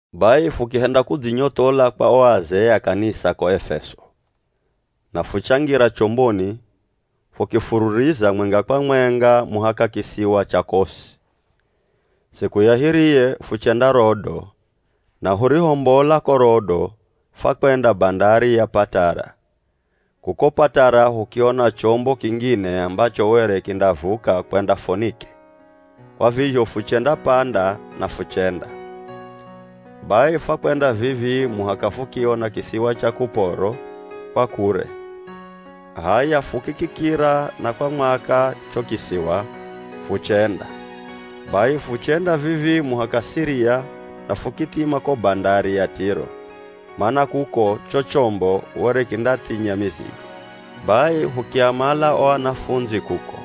Bai fukihenda kudzinyothola kwa o azee a kanisa ko Efeso na fuchangira chomboni fukifururiza mwenga kwa mwenga muhaka kisiwa cha Kosi. Siku ya hiriye fuchenda Rodo na hurihombola ko Rodo fwakwenda bandari ya Patara. Kuko Patara hukiona chombo kingine ambacho were kindavuka kwenda Fonike, kwa vizho fuchendapanda na fuchenda. Bai fwakwenda vivii muhaka fukiona kisiwa cha Kuporo kwa kure, h'aya fukikikira na kwa mwaka cho kisiwa, fuchenda. Bai fuchenda vivii muhaka Siria na fukithima ko bandari ya Tiro, mana kuko cho chombo were kindathinya mizigo. Bai hukiamala o anafundzi kuko,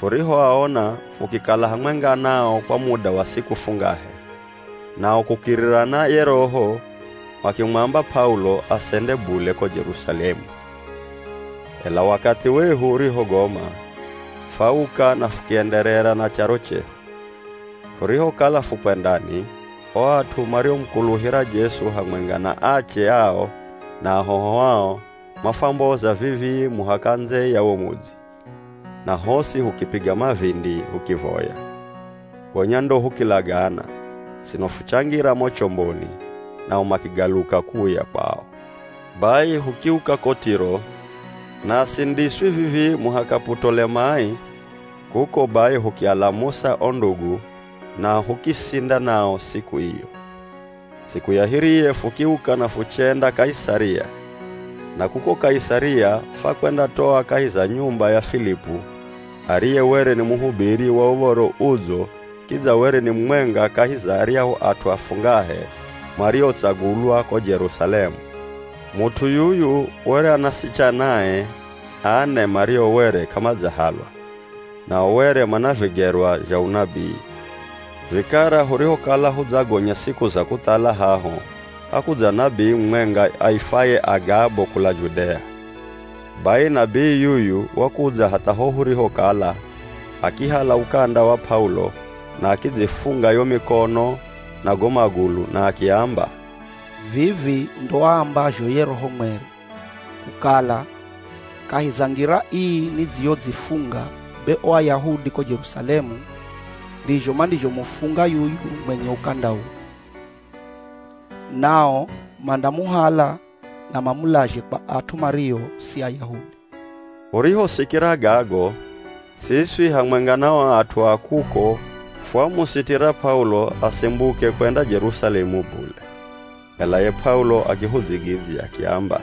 furihoaona fukikala hamwenga nao kwa muda wa siku fungahe, nao kukirira na ye Roho makimwamba P'aulo asende bule ko Jerusalemu. Ela wakathi wehu urihogoma, fwauka na fukienderera na charo chehu. Furihokala fukwendani, o at'u mariomukuluhira Jesu hamwenga na ache ao na ahoho ao mafwamboza vivii muhaka ndze ya wo mudzi, na hosi hukipiga mavindi hukivoya. Gonya ndo hukilagana, sino fuchangira mo chomboni, nao makigaluka kuuya kwao. Bai hukiuka ko Tiro, naswi ndiswi vivii muhaka Putolemai, kuko bai hukialamusa o ndugu na hukisinda nao siku iyo. Siku ya hiriye fukiuka na fuchenda Kaisaria, na kuko Kaisaria fwakwendatoa kahi za nyumba ya Filipu ariye were ni muhubiri wa Uv̱oro Udzo kidza were ni mumwenga kahi za aryahu at'u afungahe mariotsagulwa ko Jerusalemu. Mut'u yuyu were ana asichanae ane mario were k'amadzahalwa nao were mana vigerwa zha unabii. Vikara hurihokala hudzagonya siku za kuthala haho, hakudza nabii mumwenga aifwaye Agabo kula Judea. Bai nabii yuyu wakudza hatha ho hurihokala, akihala ukanda wa P'aulo na akidzifunga yo mikono na go magulu na akiamba, “Vivi ndo aambazho ye Roho Mweri, kukala, ‘Kahi za ngira ii nidzizhodzifunga be o Ayahudi ko Jerusalemu ndizho mandizhomufunga yuyu mwenye ukanda uu, nao mandamuhala na mamulazhe kwa at'u mario si Ayahudi.’” Hurihosikira gago, siswi hamwenga na o at'u a kuko fwamusitira P'aulo asimbuke kwenda Jerusalemu bule. Ela ye P'aulo akihudzigidzya akiamba,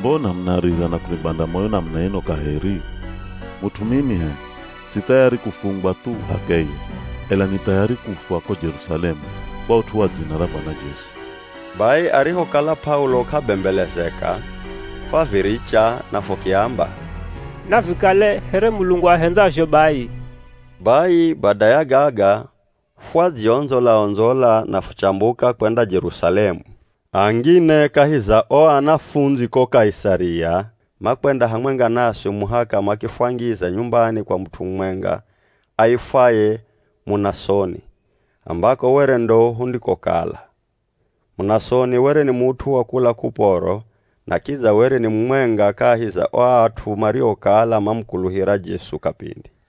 “Mbona munarira na kunibanda moyo namuna ino kaheri? Mut'u mimi h'e, si thayari kufungwa thu h'akeye, ela ni thayari kufwa ko Jerusalemu kwa ut'u wa dzina ra Bwana Jesu.” Bai arihokala P'aulo k'abembelezeka, fwaviricha na fukiamba, “Navikale here Mulungu ahendzazho bai.” Bai bada ya gaga fwadziondzola-ondzola na fuchambuka kwenda Jerusalemu. Angine kahi za o anafundzi ko Kaisaria makwenda hamwenga naswi muhaka makifwangiza nyumbani kwa mut'u mumwenga aifwaye Munasoni, ambako were ndo hundikokala. Munasoni were ni mut'u wa kula Kuporo na kidza were ni mumwenga kahi za o at'u mariokala mamukuluhira Jesu kapindi.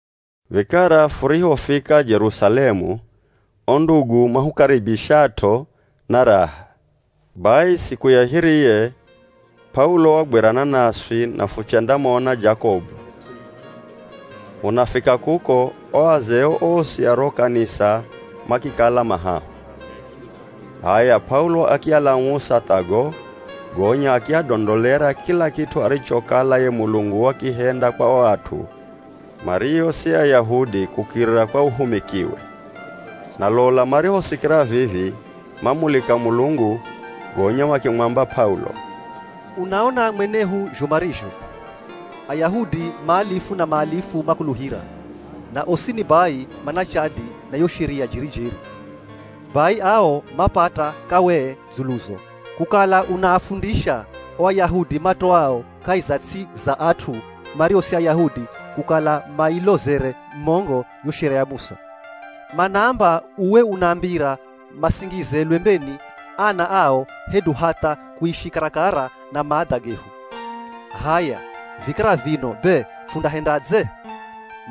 Vikara furihofika Jerusalemu, o ndugu mahukaribishat'o na raha. Bai siku ya hiriye, P'aulo wagwirana naswi na fuchendamona Jakobu. Hunafika kuko, o azee osi a ro kanisa makikala ma haho. H'aya, P'aulo akialamusa tha go, gonya akiadondolera kila kit'u arichokala ye Mulungu wakihenda kwa o at'u mario si Ayahudi kukirira kwa uhumikiwe. Na lola marihosikira vivi mamulika Mulungu, gonya makimwamba P'aulo, “Unaona mwanehu zho marizho Ayahudi maalifu na maalifu makuluhira, na osini bai mana chadi na yo Sheria jeri-jeri. Bai ao mapata kawee dzuluzo, kukala unaafundisha o Ayahudi matoao kahi za ts'i za at'u mario si Ayahudi kukala mailozere mongo yo Sheria ya Musa. Manaamba uwe unaambira masingize lwembeni ana ao hedu hatha kuishi karakara na maadha gehu. H'aya, vikara vino be fundahendadze?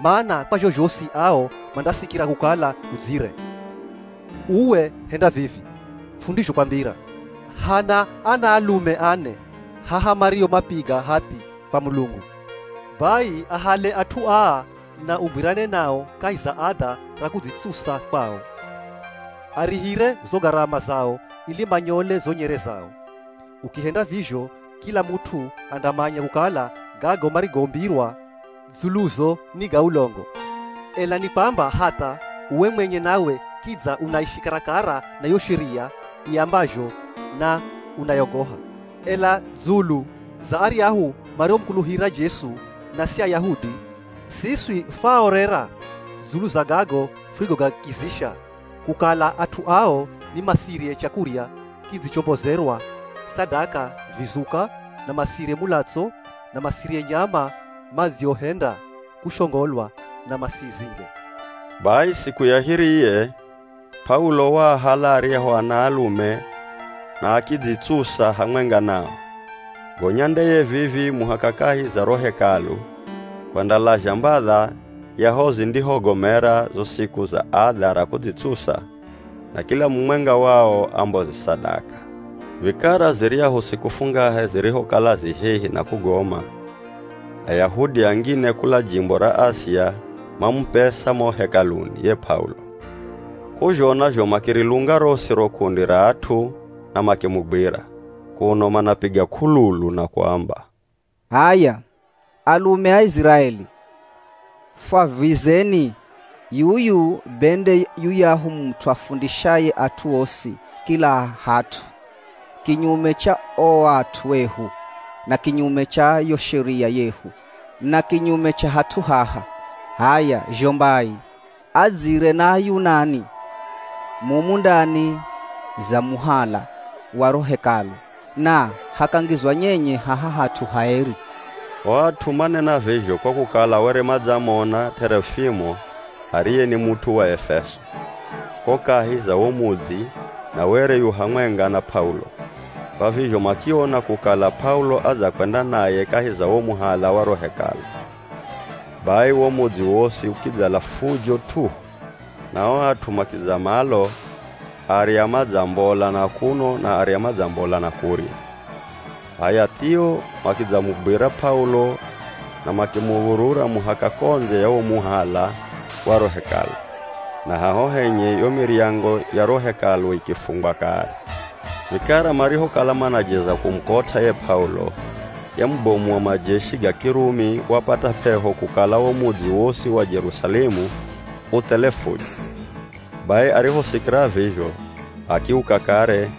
Mana kwa zhozhosi ao mandasikira kukala udzire. Uwe, henda vivi fundizhokwambira. Hana anaalume ane haha mario mapiga hathi kwa Mulungu. Bai ahale at'u aa na ugwirane nao kahi za adha ra kudzitsusa kwao, arihire zo garama zao ili manyole zo nyere zao. Ukihenda vizho kila mut'u andamanya kukala gago marigombirwa dzuluzo ni ga ulongo, ela ni kwamba hatha uwe mwenye nawe kidza unaishi karakara na yo Sheria iambazho na unayogoha. Ela, dzulu za aryahu mariomukuluhira Jesu na si Ayahudi, siswi fwaaorera dzulu za gago furigogakizisha, kukala at'u ao ni masirye chakurya kidzichombozerwa sadaka vizuka na masirye mulatso, na masirye nyama madziohenda kushongolwa na masizinge.” Bai siku ya hiriye P'aulo waahala aryahu anaalume na akidzitsusa hamwenga nao, gonya ndeye vivii muhaka kahi za ro Hekalu kwendalazha mbadha ya ho zindihogomera zo siku za adha ra kudzitsusa na kila mumwenga wao amboze sadaka. Vikara ziryahu siku fungahe zirihokala zi hehi na kugoma, Ayahudi angine kula jimbo ra Asia mamupesa mo Hekaluni ye P'aulo. K'uzhona zho makirilunga rosi ro kundi ra at'u na makimugwira, kuno manapiga k'ululu na kuamba, “H'aya, alume a Iziraeli fwavwizeni! Yuyu be nde yuyahu mut'u afundishaye at'u osi kila hat'u kinyume cha o at'u ehu na kinyume cha yo Sheria yehu na kinyume cha hat'u haha. H'aya zho mbai, adzire na Ayunani mumu ndani za muhala wa ro Hekalu na hakangizwa nyenye haha hat'u haeri.” (O at'u manena vizho kwa kukala were madzamona T'erofimo ariye ni mut'u wa Efeso, ko kahi za wo mudzi na were yu hamwenga na P'aulo, kwa vizho makiona kukala P'aulo adzakwenda naye kahi za wo muhala wa ro Hekalu.) Bai wo mudzi wosi ukidzala fujo t'uhu, na o at'u makidza malo arya madzambola na kuno na arya madzambola na kurya, h'aya thio makidzamugwira P'aulo na makimuv̱urura muhaka ko ndze ya wo muhala wa ro Hekalu, na haho henye yo miryango ya ro Hekalu ikifungwa kare. Vikara marihokala manajeza kumukot'a ye P'aulo, ye mubomu wa majeshi ga Kirumi wapata p'eho kukala wo mudzi wosi wa Jerusalemu u thele fujo. Bai arihosikira vizho, akiuka kare,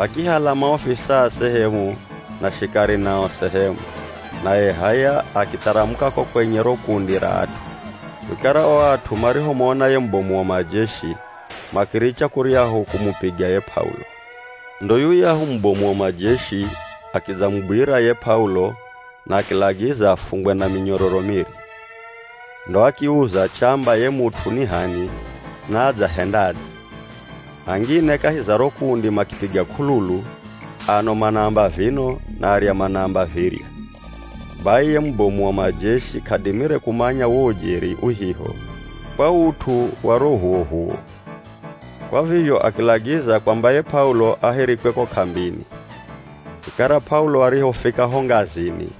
akihala maofisaa sehemu na shikari nao sehemu, naye h'aya akitharamuka ko kwenye ro kundi ra at'u. Vikara o at'u marihomona ye mubomu wa majeshi, makiricha kuryahu kumupiga ye P'aulo. Ndo yuyahu mubomu wa majeshi akidzamugwira ye P'aulo na akilagiza afungwe na minyororo miri. Ndo akiuza chamba ye mut'u ni h'ani na adzahendadze. Angine kahi za ro kundi makipiga k'ululu, ano manaamba vino na arya manaamba virya. Bai ye mubomu wa majeshi k'adimire kumanya wo ujeri uhiho kwa ut'u wa ro h'uwoh'uwo, kwa vizho akilagiza kwamba ye P'aulo ahirikwe ko k'ambini. Vikara P'aulo arihofika ho ngazini,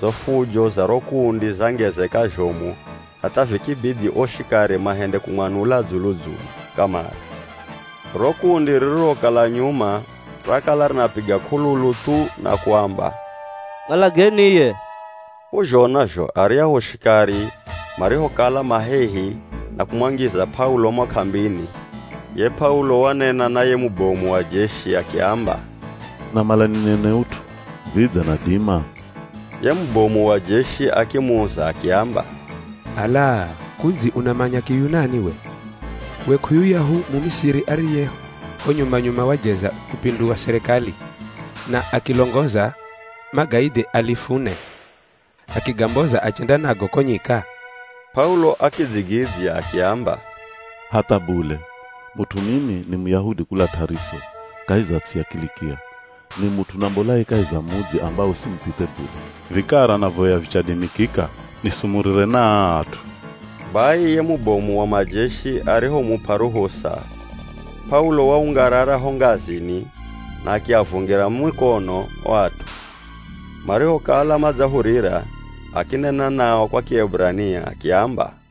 zo fujo za ro kundi zangezeka zhomu hatha vikibidhi o shikari mahende kumwanula dzulu-dzulu kamare. Ro kundi ririrokala nyuma rakala rinapiga k'ululu thu na kuamba, “Mwalageni iye!” K'uzhona zho aryahu shikari marihokala ma hehi na kumwangiza P'aulo mo k'ambini, ye P'aulo wanena na ye mubomu wa jeshi akiamba, “Namala ninene ut'u, vidze nadima?” Ye mubomu wa jeshi akimuza akiamba, “Ala, kudzi unamanya Kiyunani we? We k'uyuyahu Mumisiri ariye ho nyuma-nyuma wajeza kupindua sirikali na akilongoza magaidhi alifu ne, akigamboza achenda nago ko nyika?” P'aulo akidzigidzya akiamba, “Hatha bule, mut'u mimi ni Muyahudi kula T'ariso kahi za ts'i ya Kilikia. Ni mut'u nambolaye kahi za mudzi ambawo si muthithe bule. Vikara navoya vichadimikika nisumurire na aa at'u.” Bai ye mubomu wa majeshi arihomup'a ruhusa, P'aulo waungarara ho ngazini na akiavungira mukono o at'u, marihokala madzahurira, akinena nao kwa Kieburania akiamba,